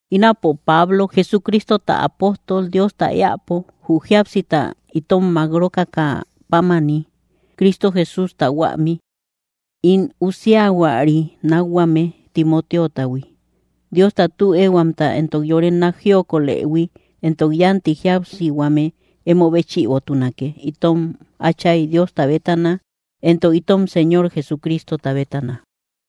Ínapo, Pablo, Jesucristota apóstol Diosta éäpo, jü jíapsita itom mák rókakä pámani, Cristo Jesústa huämi. In usiahuari nakhuame Timoteotahui. Diosta tü ehuamta, entok yore nák jiokolëhui, entok yánti jíapsihuame emo béchïbotunake, itom Áchay Diosta bétana, entok itom Señor Jesucristota bétana.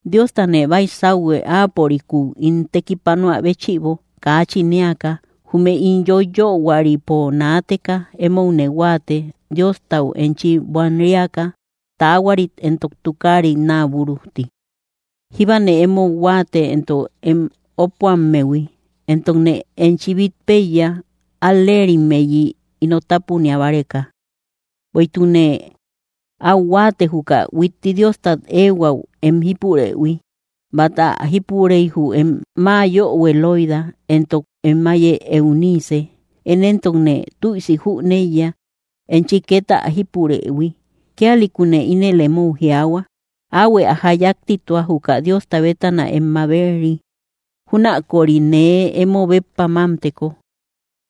Diostane baysauhue, Áapörikúu ín tekipanoä béchïbo, kaachin éaka, jume ín yoyöhuaripo naateka. Emoune huáate, Diostau enchi buanriaka taahuarit entok tukaarit naa búrujti. Jíbane emou huáate, entok em ópuammehui, entokne enchi bít péiya, al‑leerimmeyi ino tápunia báreka. Bueïtukne áu huáate, juka huitti Diostat éehuäu em jípurëhui. Bát ä jípurey, jü em ma yohue Loida, entok em áiye Eunice. Én éntokne tüisi jüneiya, enchi két ä jípurëhui. Kíalïkune ínel emou jiaahua: Áuhuë ä jáyaktitua, juka Diosta bétana em mabet‑ri, júnaköri nee emo béppa mamteko.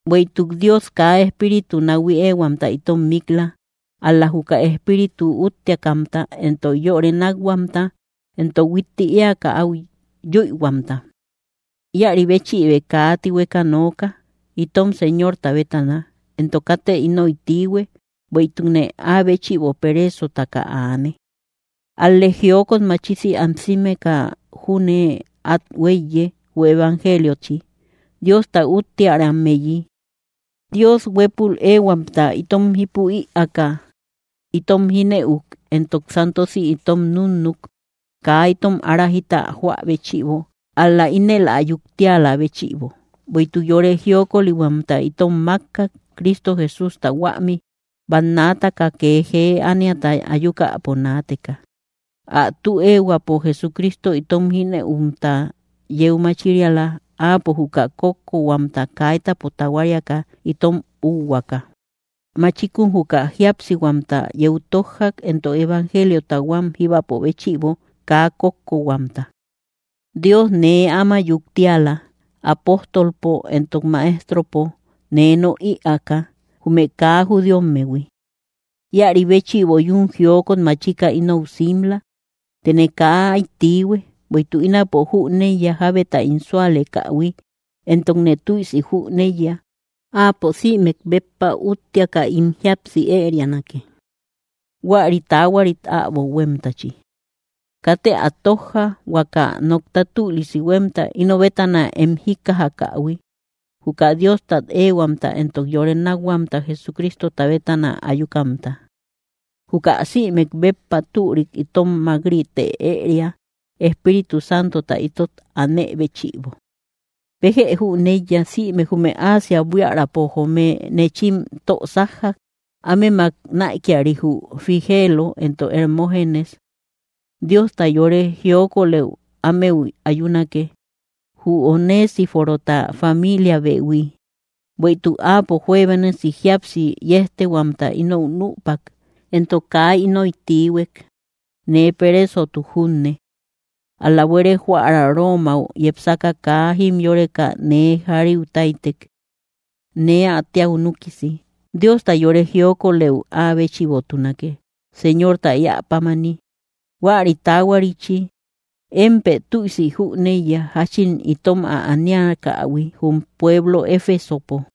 Bueïtuk Dios kaa espíriutu nahui éehuamta itom mik‑la, ál‑la juka espíritu úttiakamta, entok yore nákhuamta entok huitti éaka áu yüihuamta. Íäri béchïbë kaa tihueka nooka, itom Señorta bétana; entok katë ínoy tiihue, bueïtukne Áa béchïbo pereesotaka aane. Ál‑lë jiokot machisi ansimeka júne át huéiye jü evangeliochi, Diosta úttiärammeyi. Dios huépul éehuamta itom jípu ïaaka itom jínëuk entok santosi itom núnnuk, kaa itom ára jita joä béchïbo, ál‑la ínel ä yuktialä béchïbo, bueïtuk yore jiokolihuamta itom mákkak, Cristo Jesústa huämi, bannaataka kee jee ániata ayukäpo naateka. Ä tü éehuäpo Jesucristo itom jínëumta yeu machiriala. Áapo juka kókkohuamta kaitapo tahuariaka itom úuhuaaka, machikun juka jíapsihuamta yeu tójjak, entok evangeliota huám jíbapo béchïbo kaa kókkohuamta. Dios nee áma yuktiala, apóstolpo entok maestropo nee nok ïaaka, jume kaa judíommehui. Íäri béchïbo yún jiokot machika inou simla. Tëne kaa áy tiihue, bueïtuk ínapo jüneiya jábeta ín súalekähui; entokne tüisi jüneiya: Áapo sïmek béppa úttiaka ín jíapsi ërianake, huäri taahuarit äbo huémtachi. Katë ä tójja, huaka nokta tülisi huémta, ino bétana em jíkkajakähui, juka Diostat éehuamta entok yore nákhuamta Jesucristota bétana ayukamta. Juka sïmek béppa türik itom mák‑rite ëria, Espíritu Santota ítot anë béchïbo. Béjë jüneiya, sïme jume Asia buiärapo joome nechim tö sájjak; ámemak näikiari, jü Figeelo entok Hermoogenes. Diosta yore jiokolëu ámeu ayunake, jü Onesíforota familiabehui, bueïtuk áapo juebénasi jíapsi yéjtehuamta ínou nüpak, entok kaa ínoy tiihuek, nee pereesotuk junne. Ál‑la buere joära Romau yepsaka kaa jimyoreka nee jariu táytek, nee ä téäu núkisi. Diosta yore jiokolëu áa béchïbotunake, Señorta éä pámani, huäri taahuarichi. Émpë tüisi jüneiya, jáchin itom ä aniakähui jum pueblo Efesopo.